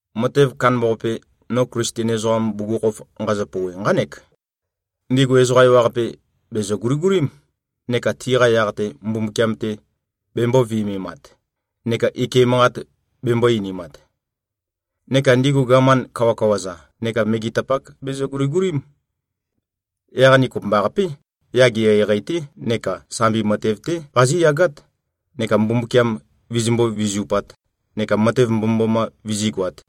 Matev kandambaqape, no Klisten ezoqam bugukhokhof nqazø-pouwe, nqánek: Ndigu ezoqa ewaqape, bèzø-guligulím, neka tiqa yaq-te Mbumbukiam-te bembō-viømemat neka ike manqat bembō-einimat. Neka ndigu gaman kawakawa-za neka megetapak bezø-guligulím. Yaq ni kopømbaqapé, yage eqeieqei-té neka sambi matev-té qazíyagát, neka Mbumbukiam vizimbó-vizupāt neka matev mbomømboma vizígoāt.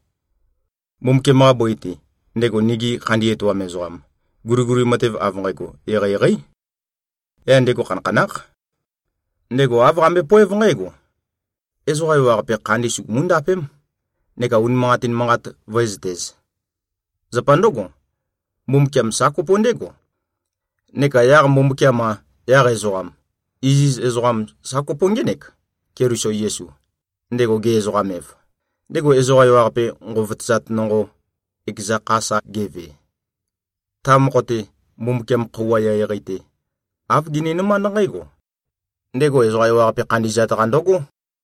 Mbumbukiam-qa bøi-te, ndego nigi khandi etoam ezoqam, guliguli matev av nqægo eqeieqeí. Yaq ndego khanakhanákh. Ndego āv qambøepoév nqǽgo: Ezoqa ewaqape khandi sugumú-ndapém neka unimanqatin manqat vǿezøtēz. Zapa ndǿgo, Mbumbukiam sa kopo ndégo. Neka yaq Mbumbukiam-a, yaq ezoqam, iziz ezoqam sa kopo ngének, Keliso Yesu, ndego ge-ezoqam-ev, ndego ezoqa ewaqape nqovotøzat nonqo, ekeza kha sa geve. Ta mokho-te, Mbumbukiam khøuwa eqeieqei-te, āv gininømánd nqǽgo: Ndego ezoqa ewaqape khandi꞉zat-qa ndøgó.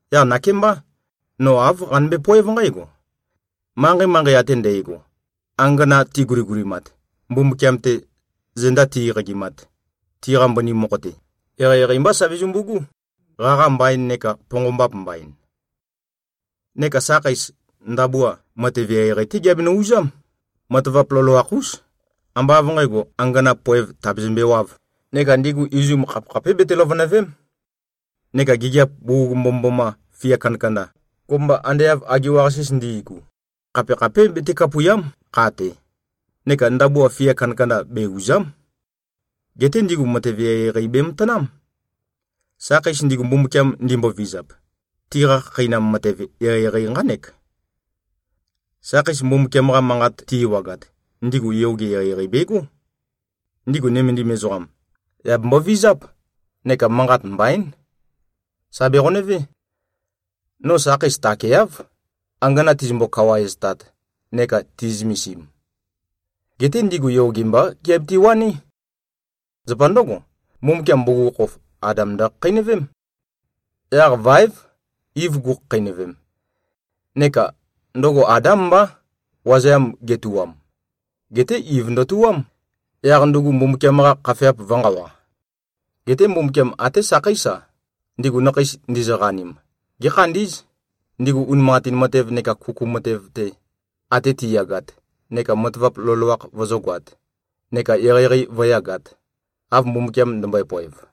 Yaq nakémbá, no āv qanømbe-poév nqǽgo: Manqei-manqei ate ndægo, angana tiguligulimat, Mbumbukiam-te zenda ti-eqagimat, tiqa mbøni mokho-te, eqeieqei mbá sa bezømbu꞉gú, qaqa mbaīn neka ponqombap mbain. Neka sakheis, ndabua, matev eqeieqei-té giabenø-uzám, matavap loloakh-ús, ambá av nqǣgo, angana poev tàbezømbewāv. Neka ndigu izum, khapekhapé bete-løvønø̀ve᷄m. Neka gigiap bugug mbomømboma fia kandakanda, kopømba ande av agiwa-qasis ndi꞉gu, khapekhapé bete-kapùia᷄m, kha-te. Neka ndabua fia kandakanda be-ùza᷄m. Geté ndigu matev eqeieqei bematanám. Sakheis ndigu, Mbumbukiam ndimbovizap, tiqa khakheinam matev eqeieqei nqánek. Sakheis Mbumbukiam-qa Manqat ti-ewagat, ndigu yoge eqeieqei begó. Ndigu nømendim ezoqam, yà bembovizáp neka manqat mbaín. Sà beqonøvé. No sakheis takeáv, angana tizømbo-kawaeztat neka ti꞉zømesim. Geté ndigu yoge mbá giabiti-waní. Zapa ndǿgo, Mbumbukiam bugukhokhof Adam ndøkhakheinøvém. Yaq váev, Iv gukhakheinøvem. Neka ndøgo Adám mbá, wazeam getuwam. Geté Iv ndøtuwám, yaq ndugu Mbumbukiam-qa khafeap vø̄nqawa. Geté Mbumbukiam até sakheís-a, ndigu nakheis ndizøqanim, gékhandí꞉z, ndigu unimanqatin matev neka kuku matev-te ate tiyagat, neka matavap loloakh vøzǿgoāt neka eqeieqei vǿyagāt, av Mbumbukiam ndømbøe-poev.